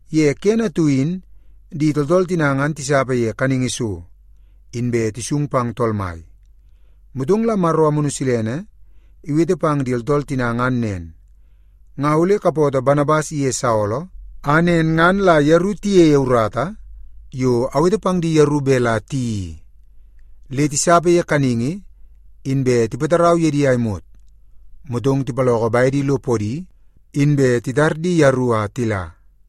Ye kene atu in di tooltool tina ngan tisapa ye kaningi so, inbe tisung pang Tool Mai. Motong la Maro Amunu Silene iwete pang di tooltool tina ngan nen, “Nga ole kapootoo Banabas iye Saolo, a nen ngan la yeru tiyeie urata yo awete pang di yeru bet la tiyeii i.” Le tisapa ye kaningi, inbe tipatarau ye di a imot, motong tipaloko bedi lo podi, inbe titar di yeru a tila.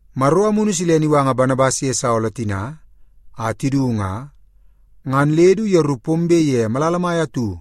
Maro Amunu Silene iwanga Banabas ye Saolo tina a tidu nga, ngan le du yeru pombe ye malala mai atu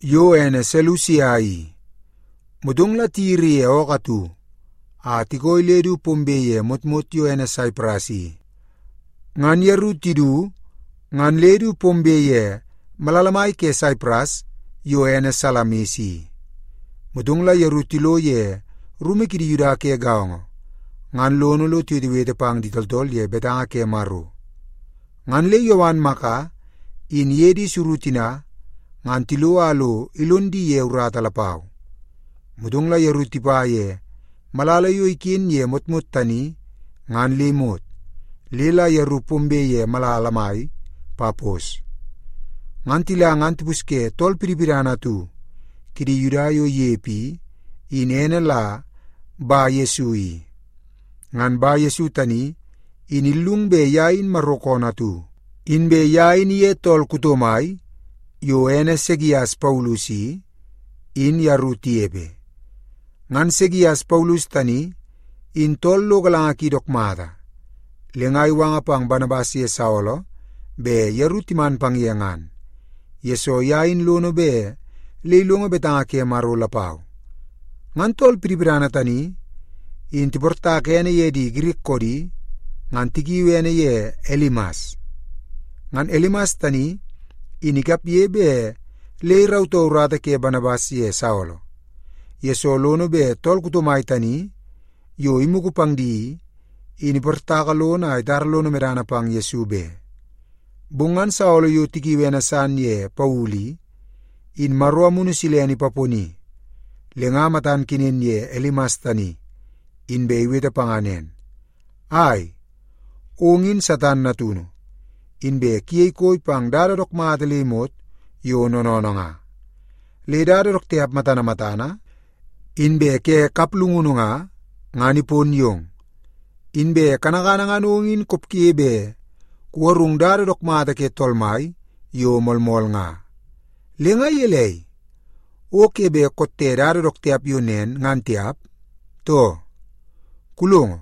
yo ene Selusia i. Motong la tiyiri ye ookoo atu a tikooi le du pombe ye motmot yo ene Saipras i. Ngan yeru tidu ngan le du pombe ye malala mai ke Saipras yo ene Salamis i. Motong la yeru tilo ye rumu kidi Yuda ke gaongo ngan lono lo tiwetewete pang di tooltool ye betanga ke Maro. Ngan le Yowan Maka in iye di suru tina ngan tilo a lo ilon di ye urata lapau. Motong la yeru tipa ye malala yo iken ye motmot tani ngan le imot, le la yeru pombe ye malala mai Papos. Ngan tila ngan tipusye tool pidipidana atu kidi Yuda yo inepe i, in ene la Bayesu i. Ngan Bayesu tani in illungu bet ye in Maro koonoo atu. Inbe ye in iye tool kuto mai yo ene Segias Paulus i, in yeru tinepe. Ngan Segias Paulus tani in tool lo galanga ki dook mata. Le nga iwanga pang Banabas ye Saolo bet yeru timan pang ye ngan, yesoo ye in lono bet le ilongo betanga ke Maro lapau. Ngan tool pidipidana tani in tiportaka ene ye di Girik koodi, ngan tikiu ene ye Elimas. Ngan Elimas tani in ikapge bet le irautoo urata ke Banabas ye Saolo, yesoo lono bet tool kuto mai tani yo imugu pang di i, in iportaka lono a itara lono medana pang Yesu be. Bong ngan Saolo yo tikiui ene san ye Paulu i, in Maro Amunu Silene ipaponi, le nga matan kenen ye Elimas tani, inbe iwete panga nen, “Ai, ong in Satan natunu, inbe kuyei koi pang dada dook mata le imot yo noonoonoo nga. Le dada dook tiap matana matana, inbe ke kaplungunu nga, ngan ipon yong. Inbe kanakana ngan ong in kopge bet kugarung dada dook mata ke Tool Mai yo moolmool nga. Le nga gelei, o ke bet kotte dada dook tiap yo nen ngan tiap, too? Kulongo,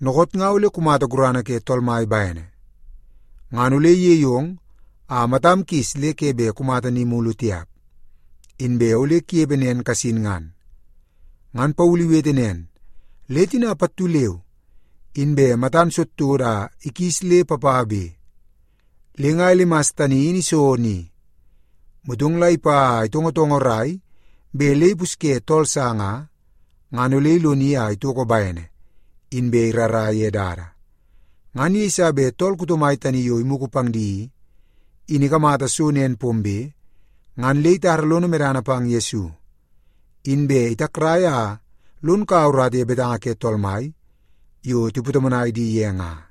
dookoot nga ole kumata gurana ke Tool Mai bene. Ngan ole iyei ong a matam kis le ke bet kumata ni mulu tiap, inbe ole kunepe nen kasin ngan.” Ngan Paulu iwete nen, le tina pattu leu inbe matan todotodo a ikis le papabe. Le nga Elimas tani in iso ni, motong la ipa a itongotongorai bet le ipusye tool sa nga, ngan ole iloni a itoko bene, inbe irara ye dada. Ngan yeiso bet tool kuto mai tani yo imugu pang di i, in ikamata so nen pombe, ngan le itara lono medana pang Yesu. Inbe itakrai a lon kaua urata ye betanga ke Tool Mai yo tipatomonai di ye nga.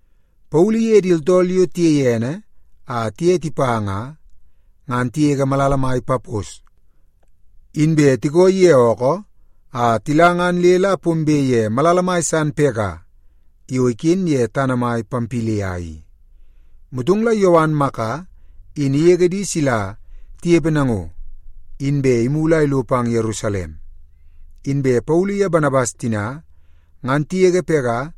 Paulu iye di tooltool yo tiyei ene a tiye tipa nga, ngan tigege malala mai Papos, inbe tikooi ye ookoo a tila ngan le la pombe ye malala mai san Pega yo iken ye tana mai Pampilia i. Motong la Yowan Maka in igege di sila tinepe nango, inbe imulu a ilo pang Yerusalem. Inbe Paulu ye Banabas tina ngan tigege Pega,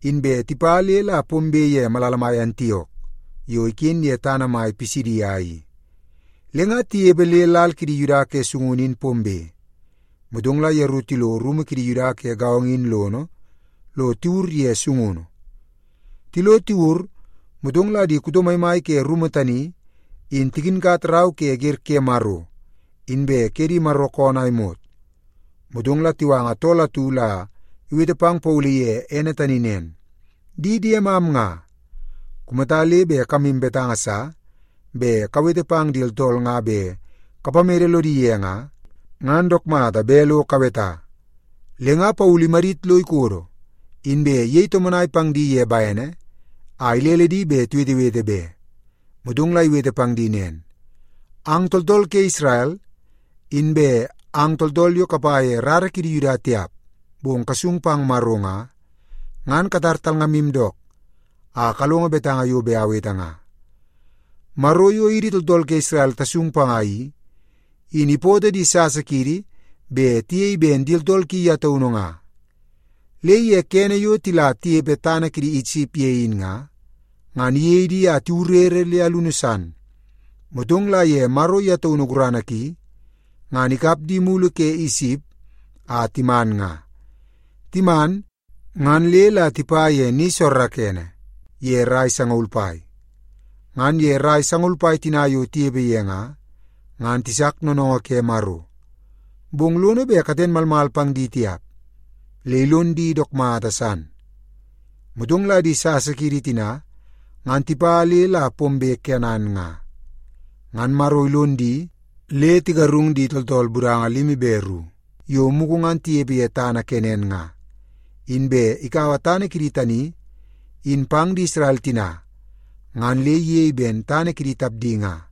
inbe tipa le la pombe ye malala mai Antiok yo iken ye tana mai Pisidia i. Le nga tinepe le lal kidi Yuda ke sungunu in pombe, motong la yeru tilo rumu kidi Yuda ke gaongo in lono lo tiwur ye sungunu. Tilo tiwur, motong la di kuto maimai ke rumu tani in tikinkat rau ke Wer ke Maro inbe ke di Maro koonoo a imot, motong la tiwanga tool atu la iwete pang Paulu iye ene tani nen, “Di diemam nga, kumata le bet kamu betanga sa bet kawete pang di tooltool nga bet kapamede lodi ye nga, ngan dook mata bet lo kaweta.” Le nga Paulu imadit lo ikodo, inbe iyei tomonai pang di ye bene a ilele di bet tiwetewete be. Motong la iwete pang di nen, “Ang tooltool ke Isrel, inbe ang tooltool yo kapa ye rara kidi Yuda tiap bong kasung pang Maro nga, ngan katar talngamu dook a kalongo betanga yo bet awete nga. Maro yo idi tooltool ke Isrel tasung panga i, in ipootoo di sasa kiidi bet tiyei ben di tooltool ki ye taunu nga. Le ye kene yo tila tinepe tana kidi Isip ye in nga, ngan iyei di a tiwurere le alunu san. Motong la ye Maro ye taunu gurana ki, ngan ikap di mulu ke Isip, a timan nga. Timan, ngan le la tipa ye ni soorookoonoo ye rai sangaul pai. Ngan ye rai sangaul pai tina yo tinepe ye nga, ngan tisak noonoongoo ke Maro, bong lono bet katen malmal pang di tiap, le ilon di dook mata san. Motong la di sasa kiidi tina ngan tipa le la pombe Kenan nga, ngan Maro ilon di le tigarung di tooltool budanga limi be ru yo mugu ngan tinepe ye tana Kenan nga, inbe ikaua tana kidi tani in pang di Isrel tina ngan le iyei ben tana kidi tapdi nga.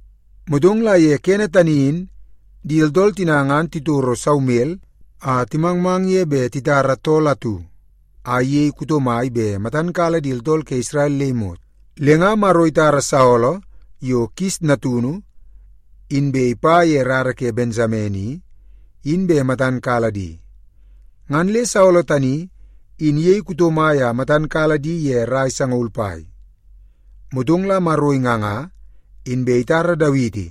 Motong la ye kene tani in di tooltool tina ngan titoro Saumel a timangmang ye bet titara tool atu a iyei kuto mai bet matan kala di tooltool ke Isrel le imot. Le nga Maro itara Saolo yo Kis natunu inbe ipa ye rara ke Bensamen i, in bet matan kala di. Ngan le Saolo tani in iyei kuto mai a matan kala di ye rai sangaul pai. Motong la Maro inganga, inbe itara Dawiti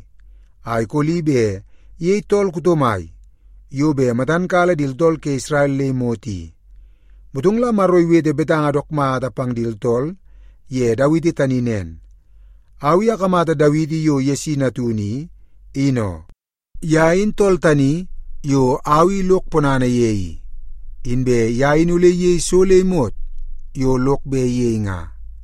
a ikoli bet iyei tool kuto mai yo bet matan kala di tooltool ke Isrel le imot i. Motong la Maro iwete betanga dook mata pang di tooltool ye Dawiti tani nen, ‘Au i akamata Dawiti yo Yesi natunu, in oo. Ye in tool tani yo au i lok ponana ye i, inbe ye in ole iyei so le imot yo lok bet iyei nga.’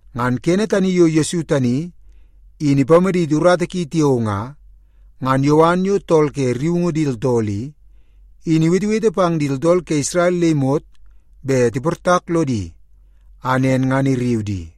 Ngan kene tani yo Yesu tani in ipamaditi urata ki tiao nga, ngan Yowan yo tool ke rriungu di tooltool i, in iwetewete pang di tooltool ke Isrel le imot bet tiportak lodi, a nen ngan irriu di.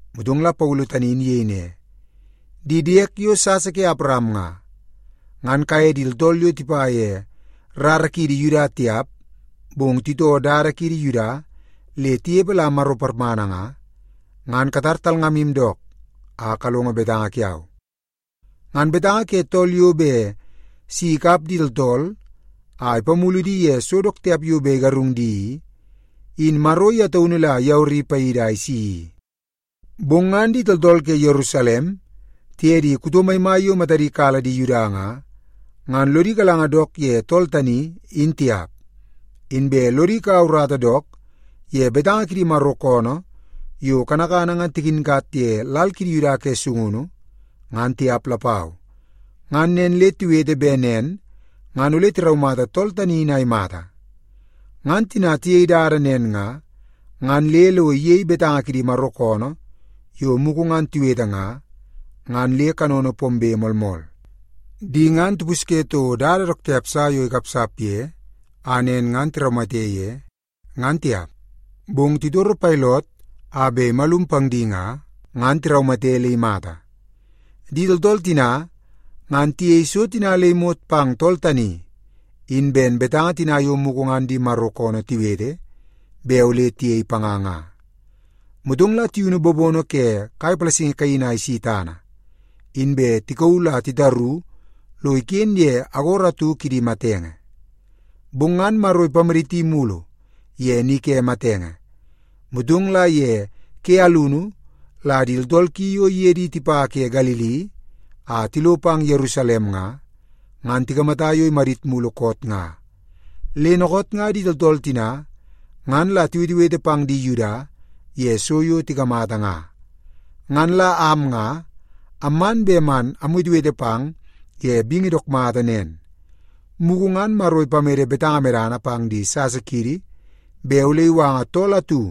Motong la Paulu tani in iyei ne, “Di diek yo sasa ke Awaram nga, ngan kaye di tooltool yo tipa ye rara kiidi Yuda tiap, bong titoo dada kiidi Yuda le tinepe la Maro parmana nga, ngan katar talngamu dook a kalongo betanga kiau. Ngan betanga ke tool yo bet si ikap di tooltool a ipamulu di ye so dook tiap yo bet igarung di i, in Maro ye taunu la iyawari paidi a isi i. Bong ngan di tooltool ke Yerusalem tiye di kuto maimai yo matadi kala di Yuda nga, ngan lodi galanga dook ye tool tani, in tiap. Inbe lodi kaua urata dook ye betanga kidi Maro koonoo yo kanakana ngan tikinkat ye lal kidi Yuda ke sungunu, ngan tiap lapau. Ngan nen le tiwete bet nen ngan ole tiraumata tool tani in a imata. Ngan tina tiyei dada nen nga, ngan le lo iyei betanga kidi Maro koonoo yo mugu ngan tiwete nga, ngan le kanono pombe moolmool. Di ngan tipusye toko dada dook tiap sa yo ikapsap ye a nen ngan tiraumate ye, ngan tiap. Bong titoro Pailot a bet imalum pang di nga, ngan tiraumate le imata. Di tooltool tina ngan tiyei so tina le imot pang tool tani in ben betanga tina yo mugu ngan di Maro koonoo tiwete bet ole tiyei panga nga. Motong la tiyunu bobono ke kai palasingi kaini a isi tana, inbe tikauu la titaru lo iken ye agoro atu kidi matenge. Bong ngan Maro ipamaditi mulu ye ni ke matenge. Motong la ye ke alunu la di tooltool ki yo iye di tipa ke Galili a tilo pang Yerusalem nga, ngan tikamata yo imadit mulu koot nga. Le dookoot nga di tooltool tina ngan la tiwetewete pang di Yuda ye so yo tikamata nga. “Ngan la am nga amman bet man amwetewete pang ye bingi dook mata nen. Mugu ngan Maro ipamede betanga medana pang di sasa kiidi bet ole iwanga tool atu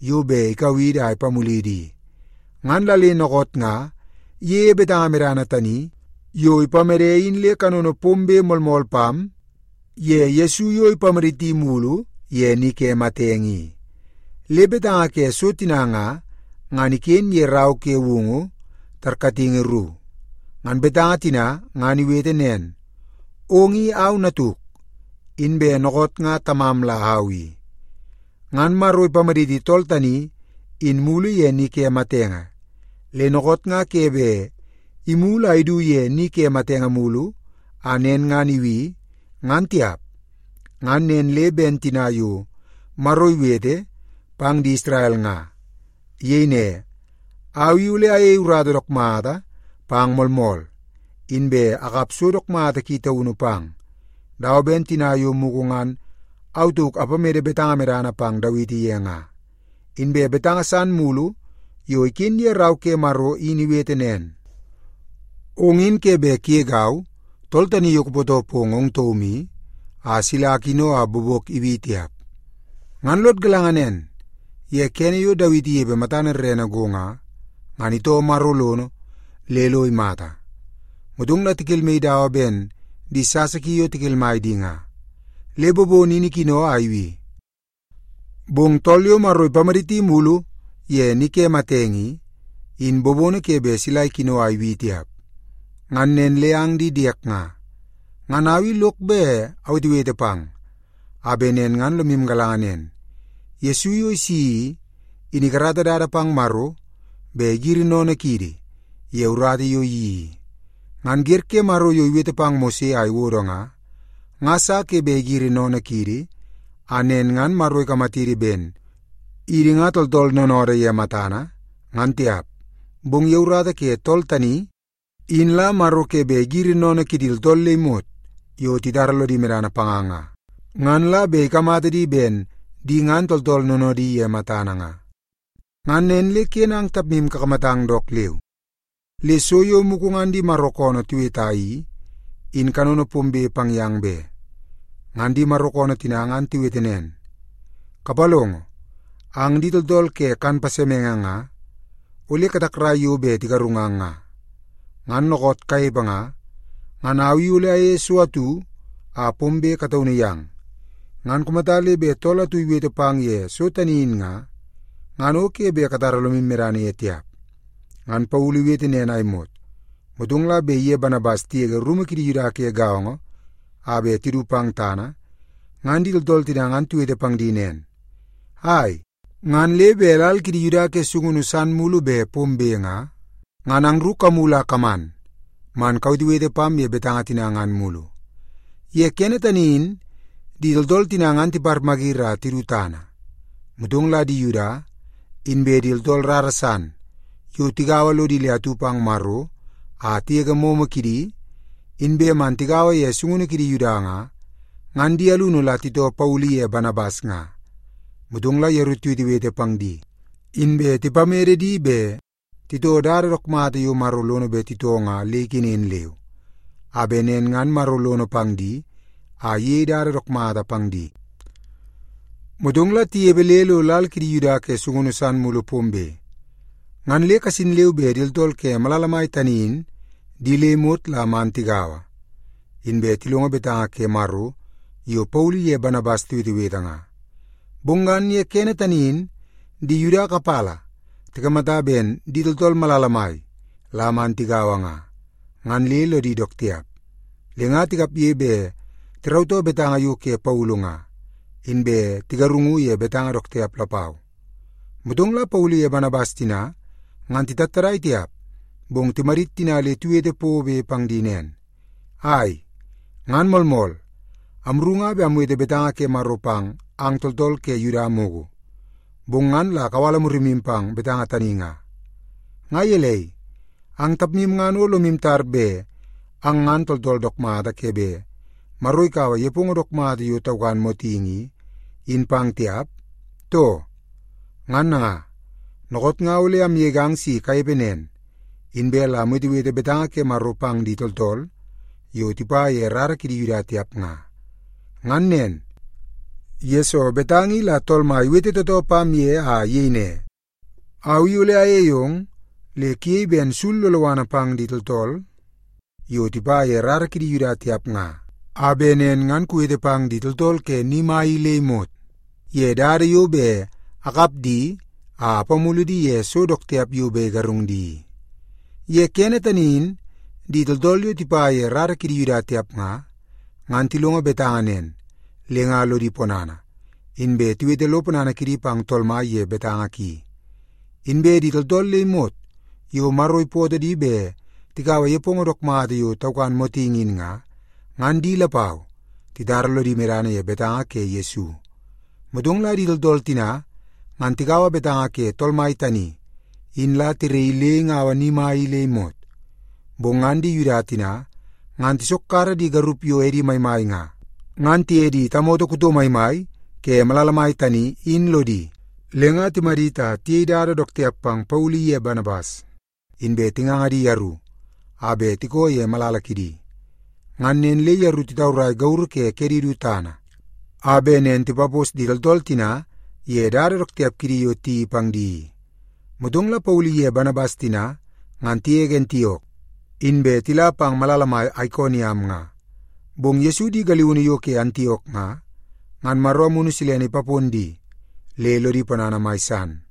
yo bet ikau idi a ipamulidi i, ngan la le dookoot nga iyeie betanga medana tani yo ipamede in le kanono pombe moolmool pam ye Yesu yo ipamaditi mulu ye ni ke matenge i. Le betanga ke so tina nga, ngan iken ye rau ke Woungu tarkatingi ru. Ngan betanga tina ngan iwete nen, ‘Ong i au Natuk, inbe dookoot nga Tamam la au i.’ Ngan Maro ipamaditi tool tani in mulu ye ni ke matenge, le dookoot nga ke bet imulu a idu ye ni ke matenge mulu a nen ngan ibi, ngan tiap. Ngan nen le ben tina yo Maro iwete pang di Isrel nga. Iyei ne, ‘Au i ole ayei urata dook mata pang moolmool, inbe akap so dook mata ki taunu pang, dawa ben tina yo mugu ngan au tauk apamede betanga medana pang Dawiti ye nga.’ Inbe betanga san mulu yo iken ye rau ke Maro in iwete nen, ‘Ong in ke bet kugegau, Tool Tani Yo Kupootoo Pong Ong Taum I, a sila akino a bobok ibi tiap.’ “Ngan lod galanga nen, ye kene yo Dawiti inepe matana rerene go nga, ngan itoo Maro lono le lo imata. Motong la tikelmaii dawa ben di sasa ki yo tikelmai di nga, le bobono in ikino a ibi. Bong tool yo Maro ipamaditi mulu ye ni ke matenge i, in bobono ke bet sila ikino a ibi tiap. Ngan nen le ang di diek nga, ngan au i lok bet awetewete pang, a bet nen ngan lomu galanga nen, Yesu yo isi i, in ikarata dada pang Maro bet igiri sennene kiidi ye urata yo iyeii i. Ngan wer ke Maro yo iwete pang Mose a iwodo nga, nga sa ke bet igiri sennene kiidi, a nen ngan Maro ikamatidi ben idi nga tooltool noonoodoo ye matana, ngan tiap. Bong ye urata ke tool tani in la Maro ke bet igiri sennene kidi tooltool le imot yo titara lodi medana panga nga, ngan la bet ikamata di ben di ngan tooltool noonoodi ye matana nga. Ngan nen le ken ang tapmu kakamatang dook leu, le so yo mugu ngan di Maro koonoo tiweta i, in kanono pombe pang yang be. Ngan di Maro koonoo tina ngan tiwete nen, ‘Kapalongo! Ang di tooltool ke kan pasemenge nga, ole katakrai yo bet tigarungang nga. Ngan dookoot kanepe nga, ngan au i ole ayeie so atu a pombe kataunu yang. Ngan kumata le bet tool atu iwete pang ye so tani in nga, ngan o ke bet katara lomu medana ye tiap.’” Ngan Paulu iwete nen a imot, motong la bet iye Banabas tigege rumu kidi Yuda ke gaongo a bet tidu pang tana, ngan di tooltool tina ngan tiwete pang di nen, “Ai, ngan le bet lal kidi Yuda ke sungunu san mulu bet pombe nga, ngan angru kamulu a kaman man kawetewete pam ye betanga tina ngan mulu.” Ye kene tani in di tooltool tina ngan tiparmayiri a tidu tana, motong la di Yuda, inbe di tooltool rara san yo tigaua lodi le atu pang Maro a tigege momo kidi, inbe man tigaua ye sungunu kidi Yuda nga, ngan di alunu la titoo Paulu iye Banabas nga. Motong la yeru tiwetewete pang di, inbe tipamede di bet titoo dada dook mata yo Maro lono bet titoo nga le ikenen leu, a bet nen ngan Maro lono pang di a iyei dada dook mata pang di. Motong la tinepe le lo lal kidi Yuda ke sungunu san mulu pombe, ngan le kasin leu be di tooltool ke malala mai tani in di le imot la man tigaua, inbe tilongo betanga ke Maro yo Paulu iye Banabas tiwetewete nga. Bong ngan ye kene tani in di Yuda kapala tikamata ben di tooltool malala mai la man tigaua nga, ngan le lodi dook tiap. Le nga tikapge bet tirautoo betanga yo ke Paulu nga, inbe tigarungu ye betanga dook tiap lapau. Motong la Paulu iye Banabas tina ngan titattadai tiap, bong timadit tina le tiwete pobe pang di nen, “Ai! Ngan moolmool, amru nga bet amwete betanga ke Maro pang ang tooltool ke Yuda mugu, bong ngan la kawala murimu pang betanga tani nga. Nga gelei, ang tapmu ngan o lomu tar bet ang ngan tooltool dook mata ke bet Maro ikaua nepongo dook mata yo taukan motingi i, in pang tiap, too? Ngan nanga, dookoot nga ole amgegang si kanepe nen, inbe la amwetewete betanga ke Maro pang di tooltool yo tipa ye rara kidi Yuda tiap nga. Ngan nen, yesoo betanga i la Tool Mai iwete tootoo pam ye a iyei ne, ‘Au i ole ayei ong le kuyei ben sul loloana pang di tooltool yo tipa ye rara kidi Yuda tiap nga, a bet nen ngan kuwete pang di tooltool ke ni mai i le imot ye dada yo bet akap di a apamulu di ye so dook tiap yo bet igarung di i.’” Ye kene tani in di tooltool yo tipa ye rara kidi Yuda tiap nga, ngan tilongo betanga nen, le nga lodi ponana, inbe tiwete lo ponana kidi pang Tool Mai ye betanga ki. Inbe di tooltool le imot yo Maro ipootoo di bet tikaua nepongo dook mata yo taukan motingi in nga, ngan di lapau titara lodi medana ye betanga ke Yesu. Motong la di tooltool tina ngan tikaua betanga ke Tool Mai tani in la tiraii le ingaua ni tani in le imot. Bong ngan di Yuda tina ngan tisokkara di garup yo edi maimai nga, ngan tiye di tamoto kuto maimai ke malala mai tani, in lodi. Le nga timadit a tiyei dada dook tiap pang Paulu iye Banabas, inbe tinganga di yeru a bet tikoo ye malala kidi. Ngan nen le yeru titaurai gauru ke kedi du tana, a bet nen tipapos di tooltool tina ye dada dook tiap kidi yo tiyeii pang di i. Motong la Paulu iye Banabas tina ngan tigege Antiok, inbe tila pang malala mai Aikoniam nga. Bong Yesu di galiunu yo ke Antiok nga, ngan Maro Amunu Silene ipapon di le lodi ponana mai san.